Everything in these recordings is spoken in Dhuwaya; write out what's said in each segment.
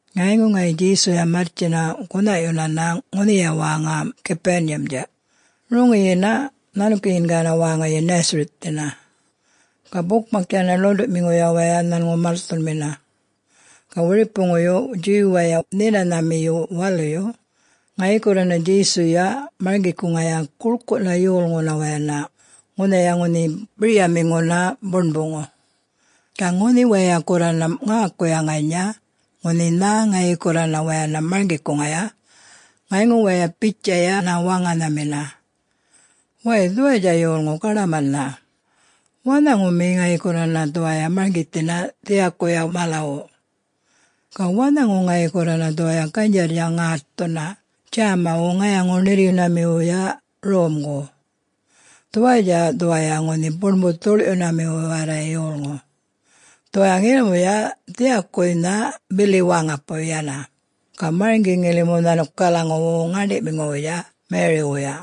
Ŋayŋu ŋayi Djesuya marrtjina gunhaꞌyunana ŋunhiya wäŋa Capernaum-dja, roŋiyina nhanukiyingayana wäŋayi Nazareth-dhina, ga bukmak yana ḻuṉḏuꞌmiŋuya waya nhanŋu malthunmina. Ga wiripuŋuyu Jew-waya Nhinanhamiyu Waluyu, ŋayi gurrana Djesuya marŋgikuŋaya guḻkuꞌna yolŋuna wayana ŋunhaya ŋunhi biryamiŋuna buṉbuŋu. Ga ŋunhi waya gurrana ŋäkuya ŋanya ŋunhi nhä ŋayi gurrana wayana marŋgikuŋaya, ŋayŋu waya bitjayana waŋanhamina, “Wäy, dhuwayatja yolŋu gaḏamanha. Wanhami ŋayi gurrana dhuwaya marŋgithinaya dhiyakuya malawu? Ga wanhaŋu ŋayi gurrana dhuwaya ganydjarrya ŋätthuna djämawu ŋayaŋu-ṉirryunamiwuya romgu? Dhuwayatja dhuwaya ŋunhi buṉbu-dhuḻꞌyunami warray yolŋu! Dhuwaya ŋilimuya dhiyakuwuynha bili wäŋapuy yana, ga marŋgi ŋilimu nhanukalaŋuwu ŋäṉḏiꞌmiŋuwuya Mary-wuya.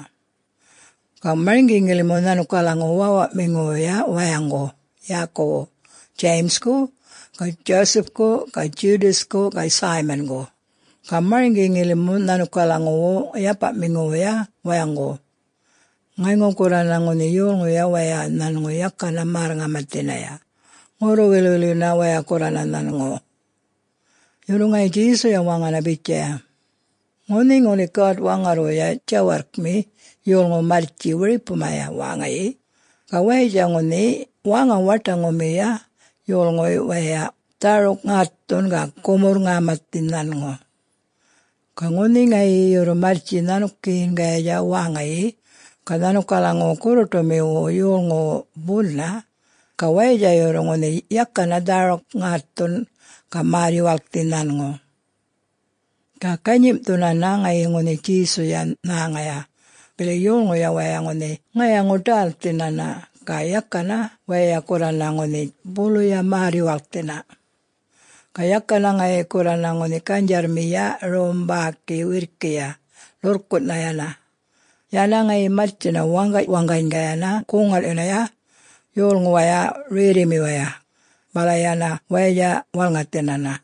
Ga marŋgi ŋilimu nhanukalaŋuwu wäwaꞌmiŋuwuya wayaŋgu yäkuwu James-ku ga Joseph-ku ga Judas-ku ga Simon-gu, ga marŋgi ŋilimu nhanukalaŋuwu yapaꞌmiŋuwuya wayaŋgu.” Ŋayŋu gurrana ŋunhi yolŋuya waya nhanŋu yakana märr-ŋamathinaya, ŋurru-wilꞌwilyunana waya gurrana nhanŋu. Yurru ŋayi Djesuya waŋana bitjaya, “Ŋunhi ŋuli God-Waŋarrwuya djawarrkmi yolŋu marrtji wiripumaya wäŋayi ga wayatja ŋunhi wäŋa-waṯaŋumiyuya yolŋuy wayay dhäruk ŋätthun ga gumurr-ŋamathi nhanŋu. Ga ŋunhi ŋayi yurru marrtji nhanukiyingayatja wäŋayi, ga nhanukalaŋuwu gurruṯumiwu yolŋuwu buna, ga wayatja yurru ŋunhi yakana dhäruk-ŋätthun ga märr-yuwalkthi nhanŋu.” Ga ganyimꞌthunana ŋayi ŋunhi Djesuyuya nhäŋaya, bili yolŋuya waya ŋunhi ŋayaŋuya-ḏälthinana ga yakana waya gurrana ŋunhi buluya märr-yuwalkthina. Ga yakana ŋayi gurrana ŋunhi ganydjarrmiya rom bäki wirrkiya, ḻurrkunꞌnha yana, yana ŋayi marrtjina waŋgaꞌ-waŋganygayana goŋ-ŋalꞌyunaya yolŋuwaya rerrimiwaya, bala yana wayatja walŋathinana.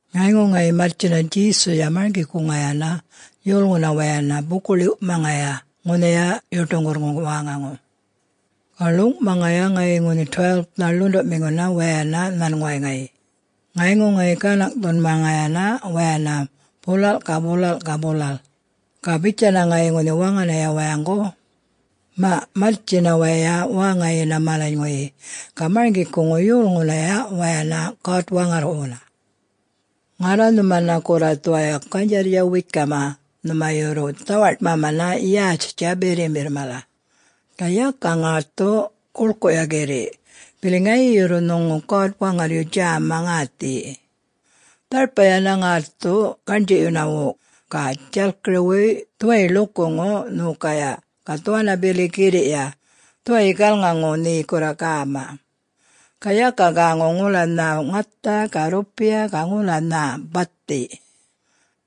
Ŋayŋu ŋayi marrtjina Djesuyuya marŋgikuŋayana yolŋuna wayana buku-ḻiwꞌmaŋaya ŋunha yuṯuŋgurrŋu wäŋaŋu. Ga ḻuŋꞌmaŋaya ŋayi ŋunhi 12-nha ḻuṉḏuꞌmiŋuna wayana nhanŋuway ŋayi, ŋayŋu ŋayi ganaŋꞌthunmaŋayana wayana bulalꞌ ga bulalꞌ ga bulalꞌ, ga bitjayana ŋayi ŋunhi waŋanaya wayaŋgu, “Maꞌ, marrtjina waya wäŋayina malanyŋuyi ga marŋgikuŋuna yolŋunaya wayana God-Waŋarrwuna. Ŋarra nhumana gurra dhuwaya ganydjarrya wekamana nhuma yurru dhawaṯmamana yätjtja birrimbirr mala. Ga yaka ŋätthu guḻkuꞌya girriꞌ bili ŋayi yurru nhuŋu God-Waŋarryu djäma ŋäthiyi. Dharpa yana ŋätthu gaṉdjiꞌyunawu ga djalkiriwuy dhuwayi ḻukuŋu nhokaya ga dhuwanna bili girriꞌya dhuwayyi galŋaŋu nhe gurra gäma. Ga yaka gäŋu ŋula nhä ŋatha ga rrupiya ga ŋula nhä bathi.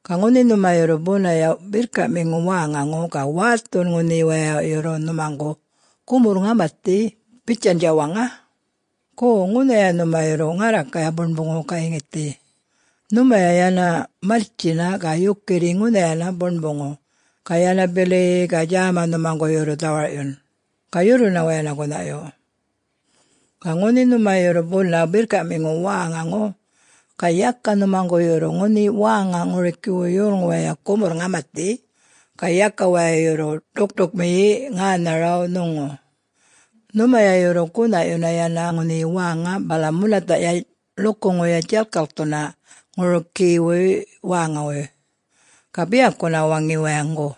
Ga ŋuli nhuma yurru bunaya birrkaꞌmiŋu wäŋaŋu ga wäthun ŋunhi waya yurru nhumaŋgu gumurr-ŋamathiya bitjandja waŋa, ‘Go, ŋunhaya nhuma yurru ŋarrakaya buṉbuŋu gayŋithi,’ nhumaya yana marrtjina ga yukirri ŋunhayana buṉbuŋu ga yana bili-i-i, ga djäma nhumaŋgu yurru dhawarꞌyun, ga yurruna wayana gunhaꞌyu. Ga ŋunhi nhuma yurru buna birrkaꞌmiŋu wäŋaŋu ga yaka nhumaŋgu yurru ŋunhi wäŋa ŋurikiwuy yolŋu waya gumurr-ŋamathi, ga yaka waya yurru ḏukṯukmiyi ŋänharaw nhuŋu, nhumaya yurru gunhaꞌyuna yana ŋunhiya wäŋa bala munathaꞌya ḻukuŋuya djalk-tjalkthuna ŋurikiwuy wäŋawuy, ga biyakuna waŋi wayaŋgu,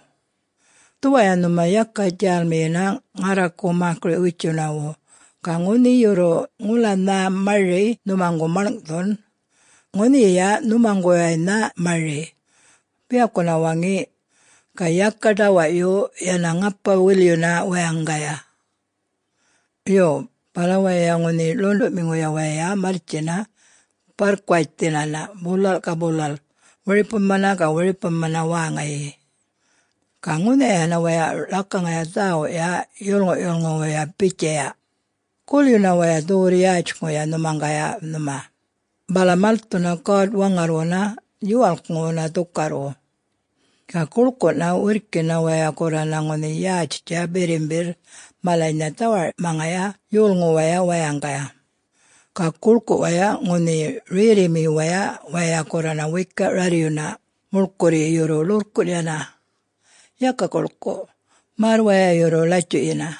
‘Dhuwaya nhuma yaka djälmiyina ŋarraku mäkiriꞌ-witjunawu, ga ŋunhi yurru ŋula nhä mari nhumaŋgu malŋꞌthun, ŋunhiyiya nhumaŋguwaynha mari,’ biyakuna waŋi, ga yaka ḏawaꞌyu, yana ŋapa-wilꞌyuna wayaŋgaya.” Yo, bala waya ŋunhi ḻuṉḏuꞌmiŋuya waya marrtjina barrkuwatjthinana bulalꞌ ga bulalꞌ wiripumana ga wiripumana wäŋayi, ga ŋunhayana waya ḻakaŋaya dhäwuꞌya yolŋuꞌ-yulŋuwuya bitjaya, “Gulyuna waya dhuwurr-yätjŋuya nhumaŋgaya nhuma, bala malthuna God-Waŋarrwuna yuwalkŋuwuna dhukarrwu.” Ga guḻkuꞌna wirrkina waya gurrana ŋunhi yätjtja birrimbirr malanynha dhawaṯmaŋaya yolŋuwaya wayaŋgaya. Ga guḻkuꞌwaya ŋunhi rerrimiwaya waya gurrana wekaꞌ rarryuna muḻkurryi yurru ḻurrkunꞌ yana, yaka guḻkuꞌ, märr waya yurru latjuꞌyina.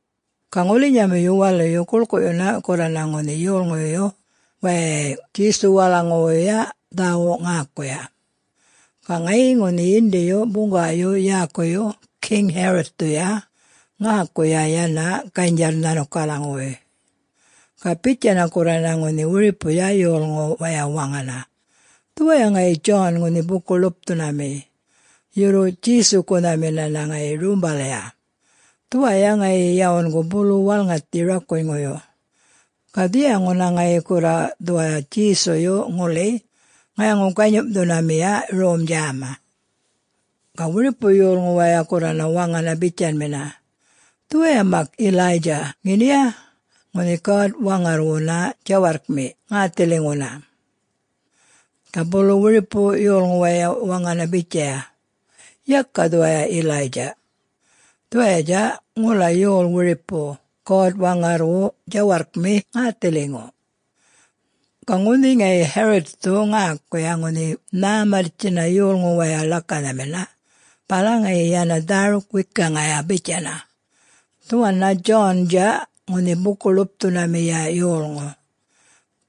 Ga ŋulinyamiyu waluyu guḻkuꞌyuna gurrana ŋunhi yolŋuyu wayay Djesuwalaŋuwuya dhäwuꞌ ŋäkuya. Ga ŋayi ŋunhi yindiyu buŋgawayu yäkuyu King Herod-thuya ŋäkuya yana ganydjarr nhanukalaŋuwuy. Ga bitjayana gurrana ŋunhi wiripuya yolŋu waya waŋana, “Dhuwaya ŋayi John ŋunhi Buku-ḻupthunami, yurru Djesu-gunhaminana ŋayi rumbalya, dhuwaya ŋayi yawungu bulu walŋathi rakunyŋuyu, ga dhiyaŋuna ŋayi gurra dhuwaya Djesuyu ŋuli ŋayaŋu-ganyimꞌthunamiya rom djäma.” Ga wiripu yolŋu waya gurrana waŋana bitjanmina, “Dhuwaya mak Elijah ŋeniya ŋunhi God-Waŋarrwuna djawarrkmi ŋäthiliŋuna?” Ga bulu wiripu yolŋu waya waŋana bitjaya, “Yaka dhuwaya Elijah, dhuwayatja ŋula yol wiripu God-Waŋarrwu djawarrkmi ŋäthiliŋu.” Ga ŋunhi ŋayi Herod-thu ŋäkuya ŋunhi ŋhä marrtjina yolŋu waya ḻakanhamina, bala ŋayi yana dhäruk wekaŋaya bitjayana, “Dhuwanna John-dja ŋunhi Buku-ḻupthunamiya yolŋu.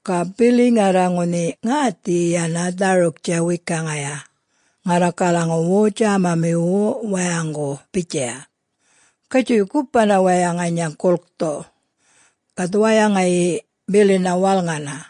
Ga bili ŋarra ŋunhi ŋäthiyi yana dhäruktja-wekaŋaya ŋarrakalaŋuwu djämamiwu wayaŋgu bitjaya, ‘Gatjuy gupana waya ŋanya gulkthu.’ Ga dhuwaya ŋayi, bilina walŋana.”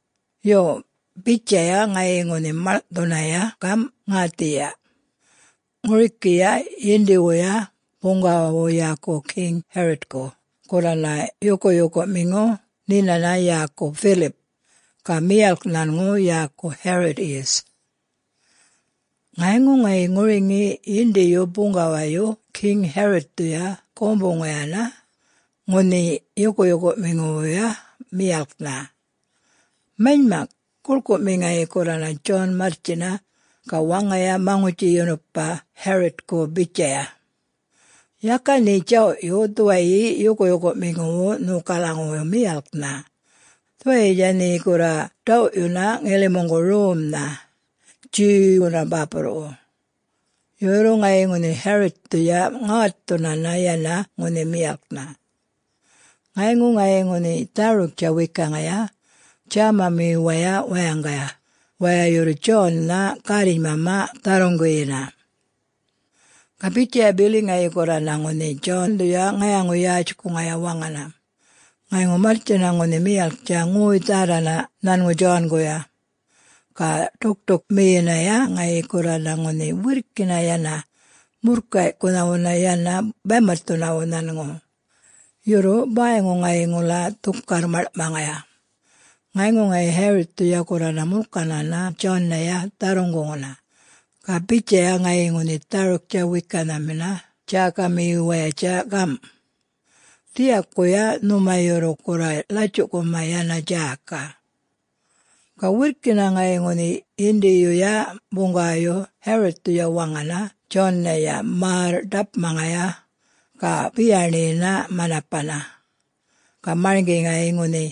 Yo, bitjaya ŋayi ŋunhi maḻŋꞌthunaya gamꞌ ŋäthiyiya. Ŋurikiya yindiwuya buŋgawawu yäkuwu King Herod-ku gurrana yukuyukuꞌmiŋu nhinana yäku Philip, ga miyalk nhanŋu yäku Herodius. Ŋayŋu ŋayi ŋuriŋi yindiyu buŋgawayu King Herod-thuya gumbuŋayana ŋunhi yukuyukuꞌmiŋuwuya miyalknha. Manymak, guḻkuꞌmi ŋayi gurrana John marrtjina ga waŋana maŋutji-yunupa Herod-ku bitjaya, “Yaka nhe djawꞌyu dhuwayi yukuyukuꞌmiŋuwu nhokalaŋuwu miyalknha. Dhuwayitja nhe gurra ḏawꞌyuna ŋilimuŋgu romnha, Jew-wuna bäpurruꞌwu.” Yurru ŋayi ŋunhi Herod-thuya ŋätthunana yana ŋunhi miyalknha. Ŋayŋu ŋayi ŋunhi dhäruktja-wekaŋaya djämamiwaya wayaŋgaya waya yurru John-na gärrinymama dharruŋguyina. Ga bitjaya bili ŋayi gurrana ŋunhi John-dhuya ŋayaŋu-yätjkuŋaya waŋana, ŋayŋu marrtjina ŋunhi miyalktja ŋoy-dhärranana nhanŋu John-guya, ga ḏukṯukmiyinaya ŋayi gurrana ŋunhi wirrkina yana murrkayꞌkunhawuna yana baymatthunawu nhanŋu, yurru bäyŋu ŋayi ŋula dhukarr maḻŋꞌmaŋaya. Ŋayŋu ŋayi Herod-thuya gurrana mulkanana John-naya dharruŋguŋuna, ga bitjaya ŋayi ŋunhi dhäruk-wekanhamina djäkamiwayatja gamꞌ, “Dhiyakuya nhuma yurru gurra latjuꞌkuma yana djäka.” Ga wirrkina ŋayi ŋunhi yindiyuya buŋgawayu Herod-thuya waŋana John-naya märryu-ḏapmaŋaya ga beyaṉiyina manapaya. Ga marŋgi ŋayi ŋunhi,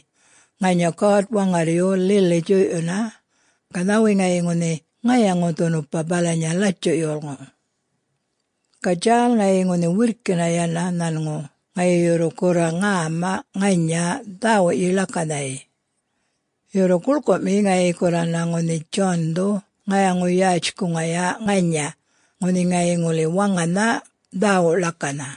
ŋanya God-Waŋarryu lili djuyꞌyuna ga nhäwi ŋayi ŋunhi ŋayaŋu-dhunupa balanya latjuꞌ yolŋu. Ga djäl ŋayi ŋunhi wirrki yana nhanŋu ŋayi yurru gurra ŋäma ŋanya dhäwuꞌyi ḻakanhayi. Yurru guḻkuꞌmi ŋayi gurrana ŋunhi John-dhu ŋayaŋu-yätjkuŋaya ŋanya ŋunhi ŋayi ŋuli waŋanha dhäwuꞌ ḻakanha.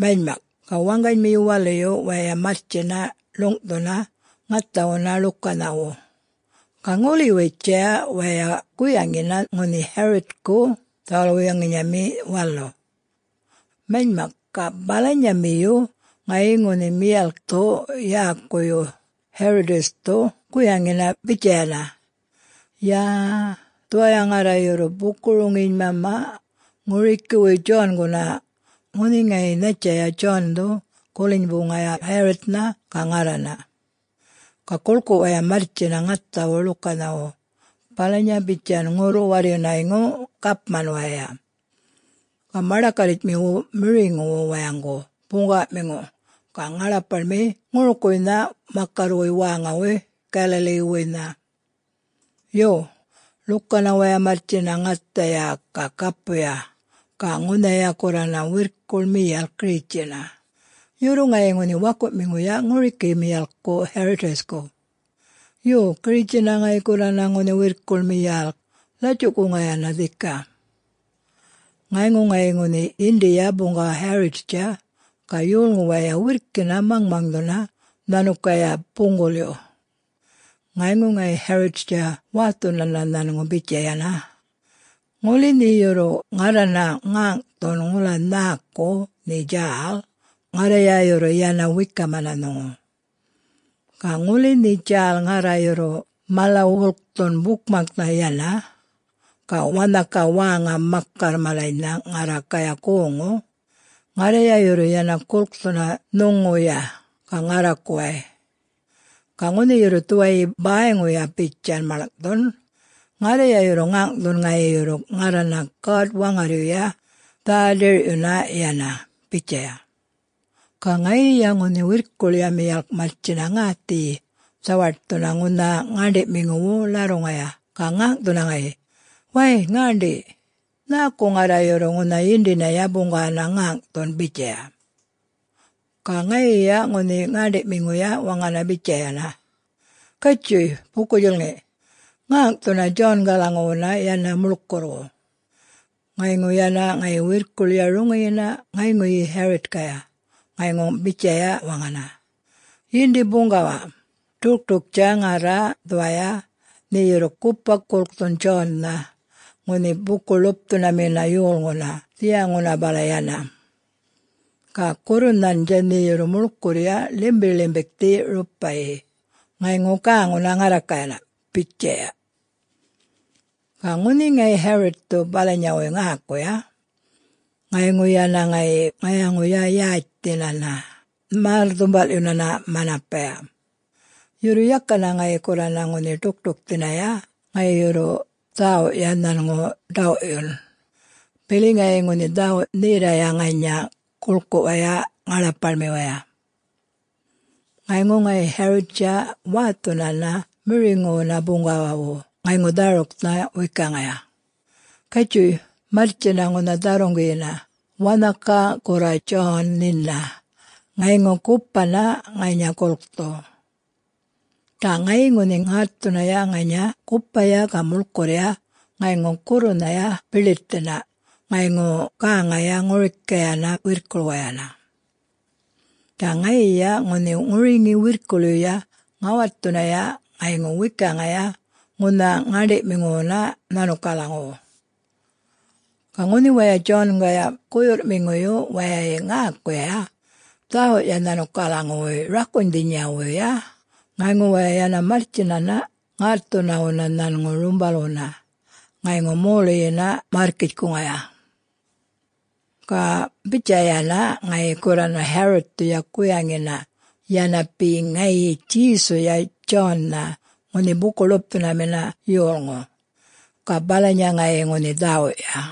Manymak, ga waŋganymiyu waluyu waya marrtjina ḻuŋꞌthuna ŋathawuna ḻukanhawu, ga ŋuliwitjaya waya guyaŋina ŋunhi Herodku dhawal-wuyaŋinyami walu. Manymak, ga balanyamiyu ŋayi ŋunhi miyalkthu yäkuyu Herodius-thu guyaŋina bitjayana, “Yä-a-a, dhuwaya ŋarra yurru buku-roŋinymamana ŋurikiwuy John-guna, ŋunhi ŋayi nhattjaya John-dhu gulinybuŋaya Herod-nha ga ŋarrana.” Ga guḻkuꞌ waya marrtjina ŋathawu lukanhawu balanya bitjan ŋurru-warryunayŋu gapman waya, ga maḏakarritjmiwu miriŋuwu wayaŋgu buŋgawaꞌmiŋu ga ŋaḻapaḻmi ŋurukuwuynha makarrwuy wäŋawuy Galilee-wuynha. Yo, ḻukanaya waya marrtjina ŋathaya ga gapuya, ga ŋunhaya gurrana wirrkuḻ miyalk giritjina, yurru ŋayi ŋunhi wakuꞌmiŋuya ŋuriki miyalkku Herodius-ku. Yo, giritjina ŋayi gurrana ŋunhi wirrkuḻ miyalk latjuꞌkuŋayana dhika. Ŋayŋu ŋayi ŋunhi yindiya buŋgawa Herod-tja ga yolŋu waya wirrkina maŋmaŋdhuna nhanukaya buŋgulyu. Ŋayŋu ŋayi Herod-tja wätthunana nhanŋu bitjayana, “Ŋuli nhe yurru ŋarrana ŋäŋꞌthun ŋula nhäku nhe djäl, ŋarraya yurru yana wekamana nhuŋu. Ga ŋuli nhe djäl ŋarra yurru mala-wulkthun bukmaknha yana, ga wanhaka wäŋa makarr malanynha ŋarrakaya goŋŋu, ŋarraya yurru yana gulkthuna nhuŋuya ga ŋarrakuway. Ga ŋunhi yurru dhuwayi bäyŋuya bitjan malŋꞌthun, ŋarra yurru ŋäŋꞌthun ŋayi yurru ŋarrana God-Waŋarryuya dhä-dirꞌyuna yana.” bitjaya. Ga ŋayiya ŋunhi wirrkuḻya miyalk marrtjina ŋäthiyi dhawaṯthuna ŋunha ŋäṉḏiꞌmiŋuwu ḻarruŋaya ga ŋäŋꞌthuna ŋayi, “Wäy... ŋäṉḏi,... nhäku ŋarra yurru ŋunha yindinaya buŋgawana ŋäŋꞌthun?” bitjaya. Ga ŋayiya ŋunhi ŋäṉḏiꞌmiŋuya waŋana bitjayana, “Gatjuy... buku-djulŋi, ŋäŋꞌthuna John-galaŋuwuna yana muḻkurrwu.” Ŋayŋu yana ŋayi wirrkuḻya roŋiyina ŋayŋuyi Herod-kaya, ŋayŋu bitjayana waŋana, “Yindi buŋgawa, ḏukṯuktja ŋarra dhuwaya nhe yurru gupa gulkthun John-nha ŋunhi Buku-ḻupthunamina yolŋuna dhiyaŋuna bala yana, ga gurrunhandja nhe yurru muḻkurrya ḻimbiḻimbiḻkthi rupaꞌyi ŋayŋu gäŋuna ŋarrakayana,” bitjaya. Ga ŋunhi ŋayi Herod-thu balanyawuy ŋäkuya, ŋayŋu yana ŋayi ŋayaŋuya-yätjthinana märr-dhumbalꞌyunana manapaya. Yurru yakana ŋayi gurrana ŋunhi ḏukṯukthinaya ŋayi yurru dhäwuꞌya nhanŋu ḏawꞌyun, bili ŋayi ŋunhi dhawuꞌ-nherraya ŋanya guḻkuꞌwaya ŋaḻapaḻmiwaya. Ŋayŋu ŋayi Herod-tja wäthunana miriŋuwuna buŋgawawu ŋayŋu dhäruknha-wekaŋaya, “Gatjuy marrtjina ŋunha dharruŋguyina wanhaka gurra John nhina ŋayŋu gupana ŋanya gulkthu.” Ga ŋayi ŋunhi ŋätthunaya ŋanya gupaya ga muḻkurrya ŋayŋu gurrunhaya biḻitthina ŋayŋu gäŋaya ŋurikayana wirrkuḻwayana. Ga ŋayiya ŋunhi ŋuriŋi wirrkuḻyuya ŋätthunaya ŋayŋu wekaŋaya ŋunha ŋäṉḏiꞌmiŋuwuna nhanukalaŋuwu. Ga ŋunhi waya John-gaya guyurrꞌmiŋuyu wayay ŋäkuya dhäwuꞌya nhanukalaŋuwuy rakunydhinyawuyya, ŋayŋu waya yana marrtjinana ŋätthunawuna nhanŋu rumbalwuna ŋayŋu moluyina märrkitjkuŋaya. Ga bitjayana ŋayi gurrana Herod-thuya guyaŋina yana be ŋayi Djesuya John-na ŋunhi Buku-ḻupthunamina yolŋu. Ga balanya ŋayi ŋunhi dhäwuꞌya.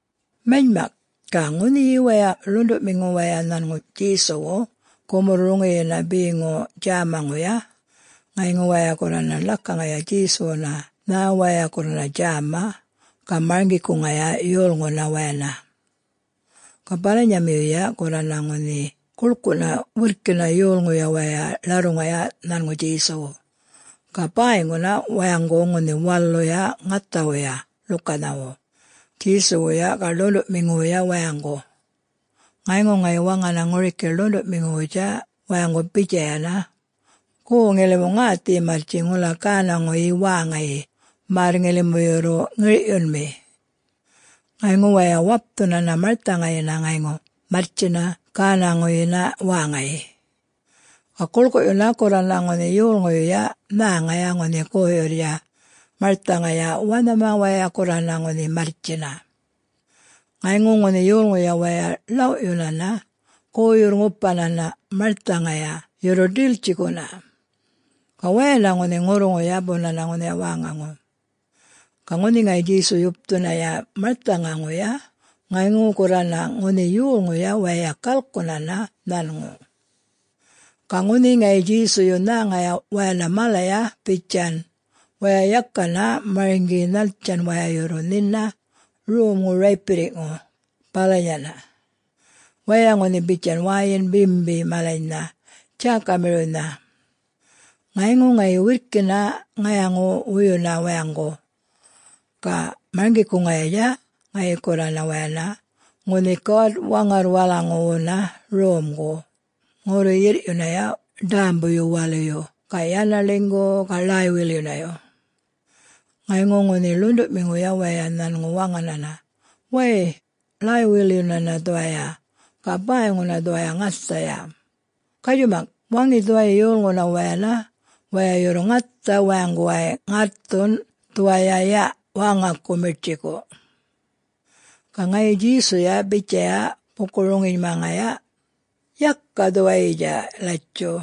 Manymak, ga ŋunhi waya ḻuṉḏuꞌmiŋu waya nhanŋu Djesuwu gumurr-roŋiyina beŋu djämaŋuya, ŋayŋu waya gurrana ḻakaŋayana Djesuwuna nhä waya gurrana djäma ga marŋgikuŋaya yolŋuna wayana. Ga balanyamiyuya gurrana ŋunhi guḻkuꞌna wirrkina yolŋuya waya ḻarruŋaya nhanŋu Djesuwu, ga bäyŋuna wayaŋgu ŋunhi waluya ŋäthawuya ḻukanhawu, Djesuwuya ga ḻuṉḏuꞌmiŋuwuya wayaŋgu. Ŋayŋu ŋayi waŋanana ŋuriki ḻuṉḏuꞌmiŋuwutja wayaŋgu bitjayana, “Go, ŋilimu ŋathiyi marrtji ŋula gänaŋuyi wäŋayi märr ŋilimu yurru ŋirꞌyunmi.” Ŋayŋu waya wapthunana marthaŋayina ŋayŋu marrtjina gänaŋuyina wäŋayi. Ga guḻkuꞌyuna gurrana ŋunhi yolŋuyuya nhäŋaya ŋunhi goyurr marthaŋaya wanhama waya gurrana ŋunhi marrtjina. Ŋayŋu ŋunhi yolŋuya waya ḻawꞌyunana goyurr-ŋupayana marthaŋanaya yurru ḏiltjiꞌkuna, ga wayana ŋunhi ŋurruŋuya bunana ŋunhaya wäŋaŋu. Ga ŋunhi ŋayi Djesu yupthunaya marthaŋaŋuya ŋayŋu gurrana ŋunhi yolŋuya waya galkunana nhanŋu. Ga ŋunhi ŋayi Djesuyu nhäŋaya wayana malaya bitjan, waya yakana marŋgi nhattjan waya yurru nhina romŋu raypirriꞌŋu, balanyana, waya ŋunhi bitjan wäyin bimbi malanynha djäkamiriwnha. Ŋayŋu ŋayi wirrkina ŋayaŋu-wuyunaya wayaŋgu, ga marŋgikuŋayatja ŋayi gurrana wayana ŋunhi God-Waŋarrwalaŋuwuna Romgu ŋurru-yirrꞌyunaya ḏämbuyu-waluyu ga yana ḻinygu-u-u, ga ḻäy-wilyunayu. Ŋayŋu ŋunhi ḻuṉḏuꞌmiŋuya waya nhanŋu waŋanana, “Wäy, ḻäy-wilyunana dhuwaya ga bäyŋuna dhuwaya ŋathaya, gatju-mak waŋi dhuwayi yolŋuna wayana waya yurru ŋatha wayaŋguway ŋätthun dhuwaya yaꞌ wäŋaku miṯtjiku.” Ga ŋayi Djesuya bitjaya buku-roŋinymaŋaya, “Yaka dhuwayitja latjuꞌ.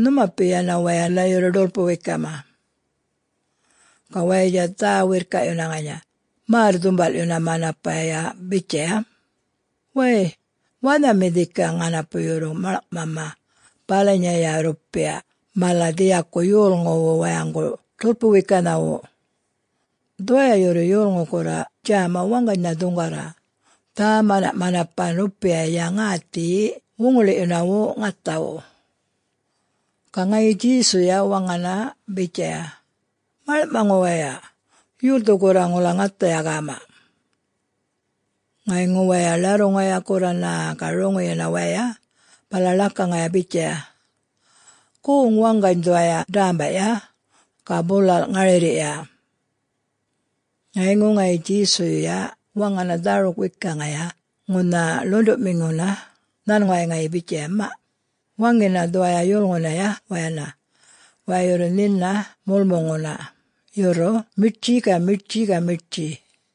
Nhumapi yana wayana yurru ḏulpu-wekama.” Ga wayatja dhä-wirrkaꞌyuna ŋanya märr-dhumbalꞌyuna manapaya bitjaya, “Wäy, wanhami dhikaꞌ ŋanapu yurru maḻŋꞌmama balanyaya rrupiya mala dhiyaku yolŋuwu wayaŋgu ḏulpu-wekanhawu? Dhuwaya yurru yolŋu gurra djäma waŋganynha dhuŋgarra dhä-manaꞌmanapan rrupiya ŋäthiyi wuŋiliꞌyunawu ŋathawu.” Ga ŋayi Djesuya waŋana bitjaya, “Maḻŋꞌmaŋu waya, yolthu gurra ŋula ŋathaya gäma?” Ŋayŋu waya ḻarruŋaya gurrana ga roŋiyina waya bala ḻakaŋaya bitjaya, “Goŋ waŋgany dhuwaya dämbaꞌya ga bulalꞌ ŋarirriꞌya.” Ŋayŋu ŋayi Djesuyuya waŋana dhäruk-wekaŋaya ŋunha ḻuṉḏuꞌmiŋuna nhanŋuway ŋayi bitjaya, “Maꞌ, waŋina dhuwaya yolŋunaya wayana waya yurru nhina mulmuŋuna yurru miṯtji ga miṯtji ga miṯtji.”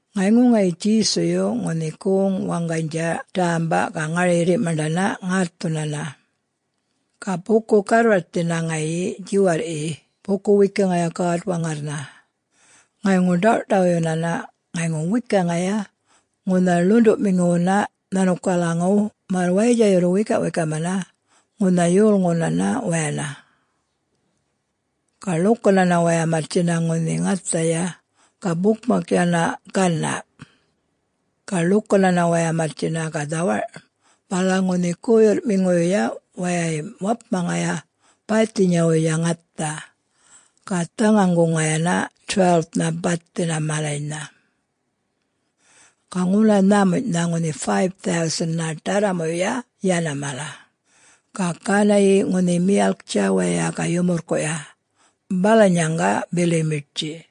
Ŋayŋu ŋayi Djesuyuya ŋunhi goŋ-waŋganydja dämbaꞌ ga ŋarirriꞌ maṉḏana ŋätthunana. Ga buku-garrwarthina ŋayi djiwarrꞌyi buku-wekaŋaya God-Waŋarrnha, ŋayŋu ḏawꞌṯawyunana ŋayŋu wekaŋaya ŋunha ḻuṉḏuꞌmiŋuwuna nhanukalaŋuw märr wayatja yurru wekaꞌwekamana ŋunha yolŋunana wayana. Ga ḻukanaya waya marrtjina ŋunhi ŋathaya ga bukmak yana ganaꞌ. Ga ḻukanana waya marrtjina ga dhawarꞌ, bala ŋunhi guyurrꞌmiŋuya wayay wapmaŋaya bäythinyawuya ŋatha, ga dhaŋaŋguŋayana 12-nha bathi malanynha. Ga ŋula nhämunyꞌnha ŋunhi 5000-na ḏarramuya yana mala, ga gänayi ŋunhi miyalktja waya ga yumurrkuꞌya balanyaŋga bili miṯtji.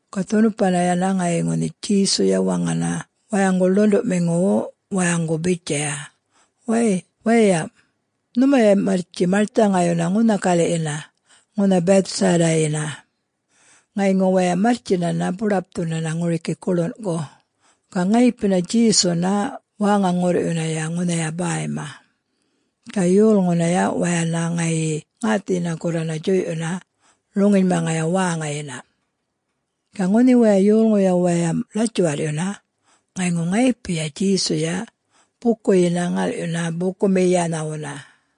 Ga dhunupana yana ŋayi ŋunhi Djesuya waŋana wayaŋgu ḻuṉḏuꞌmiŋuwu wayaŋgu bitjaya, “Wäy waya, nhumaya marrtji marthaŋayuna ŋunha galiꞌyina ŋunha Bethsaida-yina.” Ŋayŋu waya marrtjina buḏapthunana ŋuriki guḻunꞌku, ga ŋayipina Djesuna wäŋa-ŋurrꞌyunaya ŋunhaya bäymaya, ga yolŋunaya wayana ŋayi ŋäthiyina gurrana djuyꞌyuna roŋinymaŋaya wäŋayina. Ga ŋunhi waya yolŋuya waya ḻatjuwarrꞌyuna, ŋayŋu ŋayipiya Djesuya bukuyina ŋalꞌyuna bukumiyanhawuna.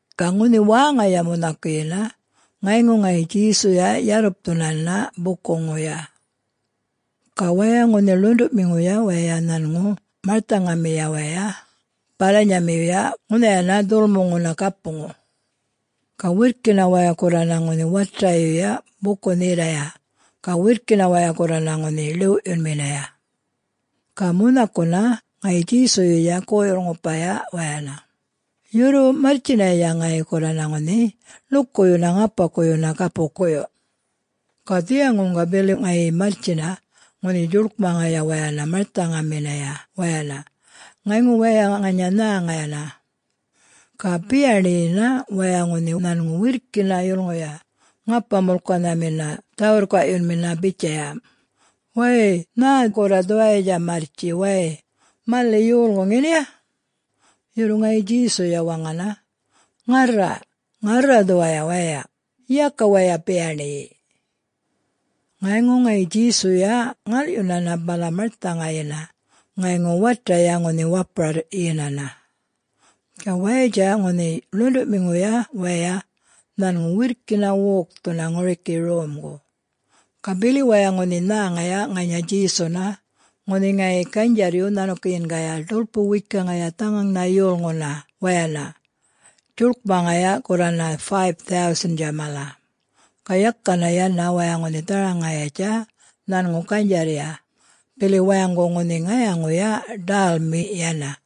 Ga ŋunhi wäŋaya munhakuyina ŋayŋu ŋayi Djesuya yarrupthunana bukuŋuya. Ga waya ŋunhi ḻuṉḏuꞌmiŋuya waya nhanŋu marthaŋamiya waya balanyamiyuya ŋunhayana dhulmuŋuna gapuŋu. Ga wirrkina wayana gurrana ŋunhi watayuya buku-nhirraya ga wirrkina waya gurrana ŋunhi ḻiwꞌyunminaya. Ga munhakuna ŋayi Djesuyuya goyurr-ŋupaya wayana, yurru marrtjinaya ŋayi gurrana ŋunhi ḻukuyuna ŋapaꞌkuyuna gapukuyu. Ga dhiyaŋuŋga bili ŋayi marrtjina ŋunhi djuḻkmaŋaya wayana marthaŋaminaya wayana ŋayŋu waya ŋanya nhäŋayana. Ga biyaṉiyina waya ŋunhi nhanŋu wirrkina yulŋuya ŋapa-mulkanhamina dhä-wirrkaꞌyunmina bitjaya, “Wäy-y-y nhä gurra dhuwayatja marrtji way, maliꞌ yolŋu ŋeniya?” Yurru ŋayi Djesuya waŋana, “Ŋarra... ŋarra dhuwaya waya. Yaka waya biyaṉiyi!” Ŋayŋu ŋayi Djesuya ŋalꞌyunana bala marthaŋayina ŋayŋu wataya ŋunhi wapurarryinana. Ga wayatja ŋunhi ḻuṉḏuꞌmiŋuya waya nhanŋu wirrkina wokthuna ŋuriki romgu. Ga bili waya ŋunhi nhäŋaya ŋanya Djesuna ŋunhi ŋayi ganydjarryu nhanukiyingaya ḏulpu-wekaŋaya dhaŋaŋnha yolŋuna wayana djuḻkmaŋaya gurrana 5000-tja mala. Ga yakana yana waya ŋunhi dharaŋayatja nhanŋu ganydjarrya, bili wayaŋgu ŋunhi ŋayaŋuya ḏälmi yana.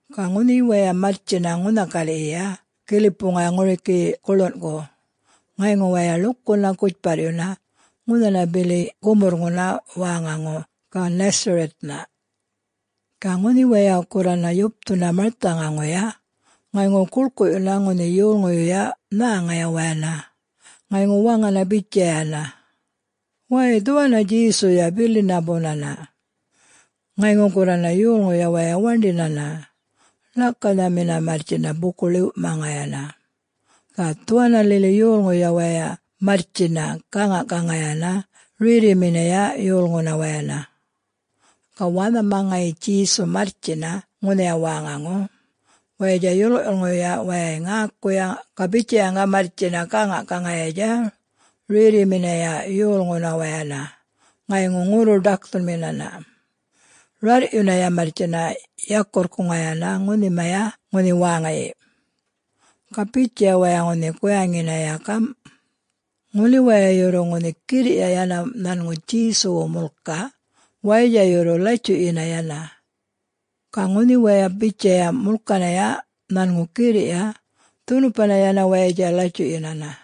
Ga ŋunhi waya marrtjina ŋunha galiꞌyiya gilipuŋaya ŋuriki guḻunꞌku, ŋayŋu waya ḻukuna gutjparryuna ŋunhana bili gumurrŋuna wäŋaŋu Gennesaret-na. Ga ŋunhi waya gurrana yupthuna marthaŋaŋuya, ŋayŋu guḻkuꞌyuna ŋunhi yolŋuyuya nhäŋaya wayana ŋayŋu waŋana bitjayana, “Waya dhuwanna Djesuya bilina bunana.” Ŋayŋu gurrana yolŋuya waya waṉḏinana, ḻakanhamina marrtjina buku-ḻiwꞌmaŋayana, ga dhuwanna lili yolŋuya waya marrtjina gäŋaꞌgaŋayana rerriminaya yolŋuna wayana. Ga wanhama ŋayi Djesu marrtjina ŋunhaya wäŋaŋu, wayatja yolŋuyuya wayay ŋäkuya ga bitjayaŋga marrtjina gäŋaꞌgaŋayatja rerriminaya yolŋuna wayana ŋayŋu ŋurru-ḏakthunminana, rarrꞌyunaya marrtjina yakurrkuŋayana ŋunhimaya ŋunhi wäŋayi. Ga bitjaya waya ŋunhi guyaŋinaya gamꞌ, “Ŋuli waya yurru ŋunhi girriꞌya yana nhanŋu Djesuwu mulka wayatja yurru latjuꞌyina yana.” Ga ŋunhi waya bitjaya mulkanaya nhanŋu girriꞌya dhunupana yana wayatja latjuꞌyinana.